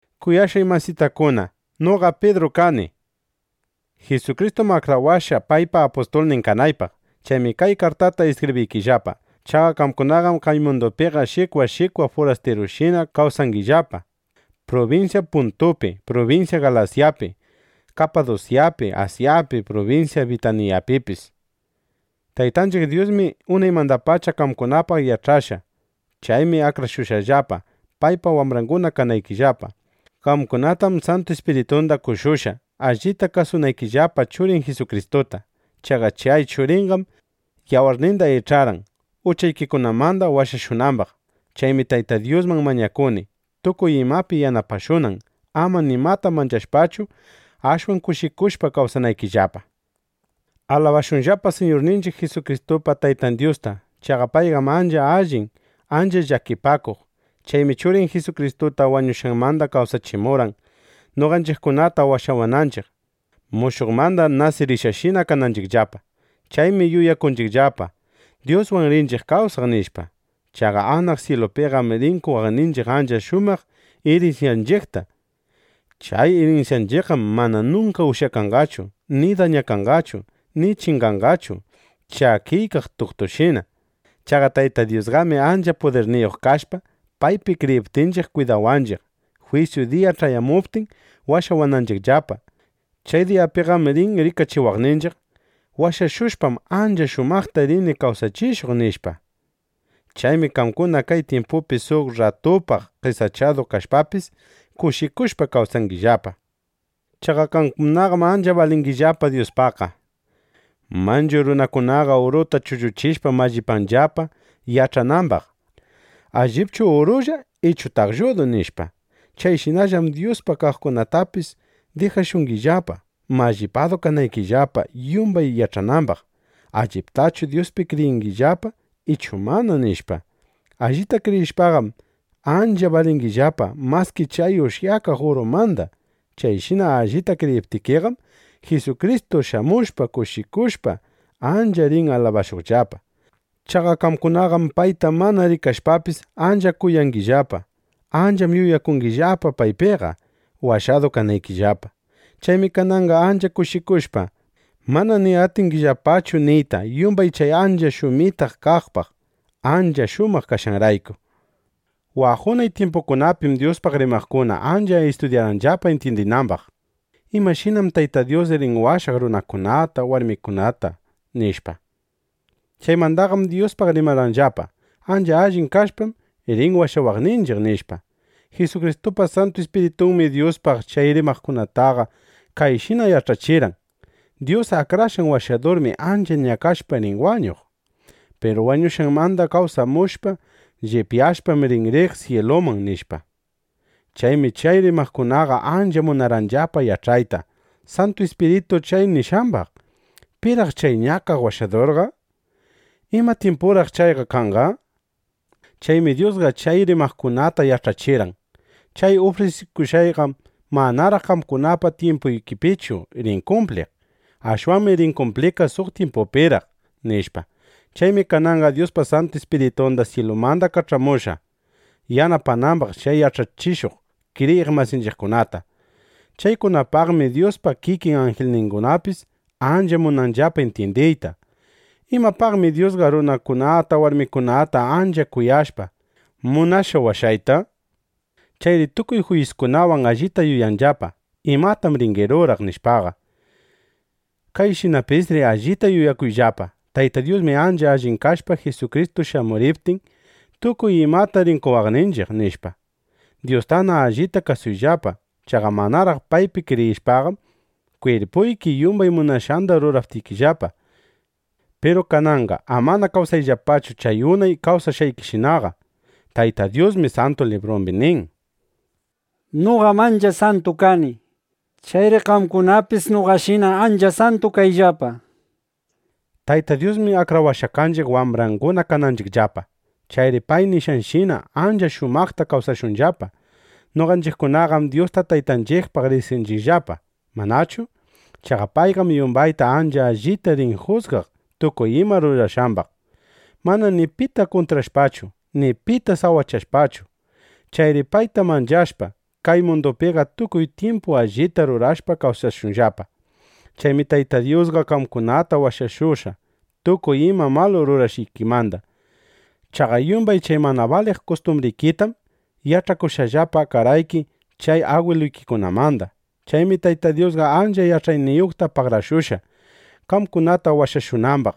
Kuyashqay masitakuna, noqam Pidru kani. Jisukristum akrawashqa, paypa apustulnin kanaypaq. Chaymi kay kartata iskibriykillapa. Chaqa qamkunaqam kay mundupiqa shikwa shikwa furastirushina kawsangillapa prubinsya Puntupi, prubinsya Galasyapi, Kapadusyapi, Asyapi, prubinsya Bitiñapipis. Taytanchiq Dyusmi unaymandapacha qamkunapaq yach'ashqa. Chaymi akrashushqallapa, paypa wambranguna kanaykillapa. Qamkunatam Santu Ispiritunda qoshushqa, allita kasunaykillapa Churin Jisukristuta. Chaqa chay Churinqam yawarninda ich'arqan, uchaykikunamanda washashunambaq. Chaymi Tayta Dyusman mañakuni, tukuy imapi yanapashunan, ama nimata manchashpachu, ashwan kushikushpa kawsanaykillapa. ¡Alabashunllapa Siñurninchiq Jisukristupa Taytan Dyusta! Chaqa payqam ancha allin, ancha llakipakuq. Chaymi Churin Jisukristuta wañushqanmanda kawsachimurqan, noqanchiqkunata washawananchiq, mushuqmanda nasirishqashina kananchiqllapa. Chaymi yuyakunchiqllapa: Dyuswan rinchiq kawsaq, nishpa. Chaqa anaq syilupiqam rin qowaqninchiq ancha shumaq irinsyanchiqta. Chay irinsyanchiqqam mana nunka ushyakanqachu ni dañakanqachu ni chinganqachu chakiykaq tuktushina. Chaqa Tayta Dyusqami ancha pudirniyuq kashpa, paypi kriyiptinchiq kwidawanchiq, jwisyu diya ch'ayamuptin, washawananchiqllapa. Chay diyapiqam rin rikachiwaqninchiq: “Washashushpam, ancha shumaqta rini kawsachishuq”, nishpa. Chaymi qamkuna kay tyimpupi suq rratupaq qesachadu kashpapis, kushikushpa kawsangillapa. Chaqa qamkunaqam ancha balingillapa Dyuspaqqa. Manchu runakunaqa uruta chulluchishpa mallipanllapa, yach'anambaq: ¿Allipchu urulla ichu taqlludu? nishpa. Chayshinallam Dyusqa qamkunatapis dijashungillapa, mallipadu kanaykillapa, yumbay yach'anambaq: ¿Alliptachu Dyuspi kriyinllapa ichu mana? nishpa. Allita kriyishpaqam, ancha balingillapa maski chay ushyakaq urumanda. Chayshina allita kriyiptikiqam, Jisukristu shamushpa, kushikushpa, ancha rin alabashuqllapa. Chaqa qamkunaqam payta mana rikashpapis, ancha kuyangillapa. Ancham yuyakungillapa paypiqa, washadu kanaykillapa. Chaymi kananqa ancha kushikushpa, mana ni atingillapachu niyta yumbay chay ancha shumitaq kaqpaq, ancha shumaq kashqanrayku. Waq unay tyimpukunapim Dyuspaq rimaqkunaqa ancha istudyarqanllapa intyindinambaq: ¿Imashinam Tayta Dyus rin washaq runakunata, warmikunata? nishpa. Chaymandaqam Dyuspaq rimarqanllapa: “Ancha allin kashpam, rin washawaqninchiq”, nishpa. Jisukristupa Santu Ispiritunmi Dyuspaq chay rimaqkunataqa kayshina yach'achirqan: Dyus Akrashqan Washadurmi ancha ñakashpa rin wañuq. Piru wañushqanmanda kawsamushpa, llipyashpam, rin riq syiluman, nishpa. Chaymi chay rimaqkunaqa ancha munarqanllapa yach'ayta Santu Ispiritu chay nishqambaq: ¿Piraq chay ñakaq Washadurqa? ¿Ima tyimpuraq chayqa kanqa? nishpa. Chaymi Dyusqa chay rimaqkunata yach'achirqan: “Chay ufrisikushqayqam manaraq qamkunapa tyimpuykipichu rin kumpliq. Ashwanmi rin kumpliqqa suq tyimpupiraq”, nishpa. Chaymi kananqa Dyusqa Santu Ispiritunda syilumanda kach'amushqa, yanapanambaq chay yach'achishuq kriyiq masinchiqkunata. Chaykunapaqmi Dyuspa kikin anjilningunapis ancha munanllapa intyindiyta: ¿Imapaqmi Dyusqa runakunata warmikunata ancha kuyashpa, munashqa washayta? nishpa. Chayri tukuy jwisyuykiwan allita yuyayllapa: ¿Imatam rini ruraq? nishpaqa. Kayshinapisri allita yuyakuyllapa: Tayta Dyusmi ancha allin kashpa, Jisukristu shamuriptin, tukuy imata rin qowaqninchiq, nishpa. Dyustana allita kasuyllapa. Chaqa manaraq paypi kriyishpaqam, kwirpuyki yumbay munashqanda rurarqaykillapa. Piru kananqa amana kawsayllapachu chay unay kawsashqaykishinaqa. Tayta Dyusmi Santu Librumbi nin: “Noqam ancha santu kani. Chayri qamkunapis noqashina ancha santu kayllapa”, nishpa. Tayta Dyusmi akrawashqa kanchiq, wambranguna kananchiqllapa. Chayri pay nishqanshina, ancha shumaqta kawsashunllapa. Noqanchiqkunaqam Dyusta Taytanchiqpaq riqsinchiqllapa, ¿manachu? Chaqa payqam yumbayta ancha allita rin jusgaq tukuy ima rurashqambaq, mana ni pita kuntrashpachu ni pita sawachashpachu. Chayri payta manchashpa, kay mundupiqa tukuy tyimpu allita rurashpa kawsashunllapa. Chaymi Tayta Dyusqa qamkunata washashushqa tukuy ima malu rurashqaykimanda. Chaqa yumbay chay mana baliq kustumbrikitam yach'akushqallapa karqayki chay agwiluykikunamanda. Chaymi Tayta Dyusqa ancha ch'aniyuqta pagarakushqa, qamkunata washashunambaq.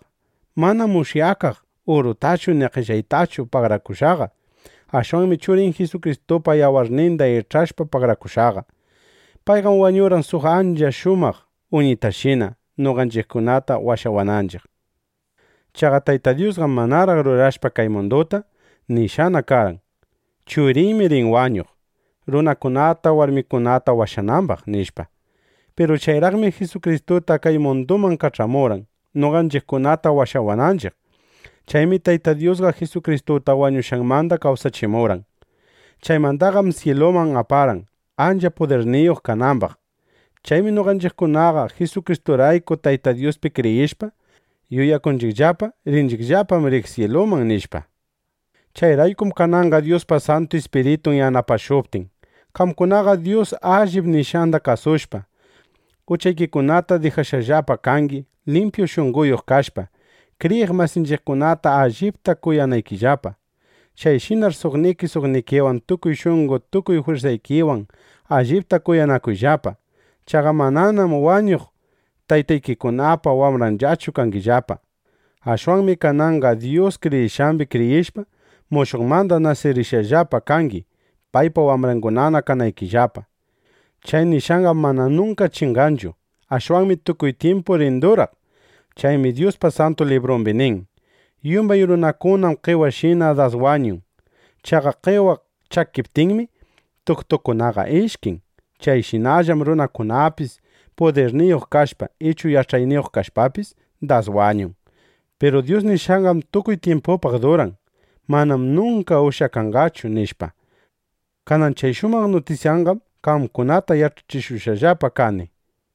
Manam ushyakaq urutachu ni qellaytachu pagarakushqaqa. Ashwanmi Churin Jisukristupa yawarninda ich'ashpa pagarakushqaqa. Payqam wañurqan suq ancha shumaq uñitashina, noqanchiqkunata washawananchiq. Chaqa Tayta Dyusqam manaraq rurashpa kay munduta, nishqana karqan: “Churiymi rin wañuq, runakunata, warmikunata washanambaq”, nishpa. Piru chayraqmi Jisukristuta kay munduman kach'amurqan, noqanchiqkunata washawananchiq. Chaymi Tayta Dyusqa Jisukristuta wañushqanmanda kawsachimurqan. Chaymandaqam syiluman aparqan, ancha pudirniyuq kanambaq. Chaymi noqanchiqkunaqa Jisukristurayku Tayta Dyuspi kriyishpa, yuyakunchiqllapa: Rinchiqllapam riq syiluman, nishpa. Chayraykum kananqa Dyuspa Santu Ispiritun yanapashuptin, qamkunaqa Dyus allip nishqanda kasushpa, uchaykikunata dijashqallapa kangi, limpyu shunqoyuq kashpa, kriyiq masinchiqkunata allipta kuyanaykillapa. Chayshinar suqniki suqnikiwan tukuy shunqo tukuy jwirsaykiwan allipta kuyanakuyllapa. Chaqa mananam wañuq taytaykikunapa wambranllachu kangillapa. Ashwanmi kananqa Dyus nishqambi kriyishpa, mushuqmanda nasirishqallapa kangi, paypa wambrangunana kanaykillapa. Chay nishqanqam mana nunka chinganchu. Ashwanmi tukuy tyimpu rin duraq. Chaymi Dyuspa Santu Librumbi nin: Yumbay runakunam qewashina das wañun. Chaqa qewa chakiptinmi, tuktunqa ishkin. Chayshinallam runakunapis, pudirniyuq kashpa ichu yach'ayniyuq kashpapis, das wañun. Piru Dyus nishqanqam tukuy tyimpupaq duran. Manam nunka ushyakanqachu, nishpa. Kanan chay shumaq nishqandaqam qamkunata yach'achishushqallapa kani.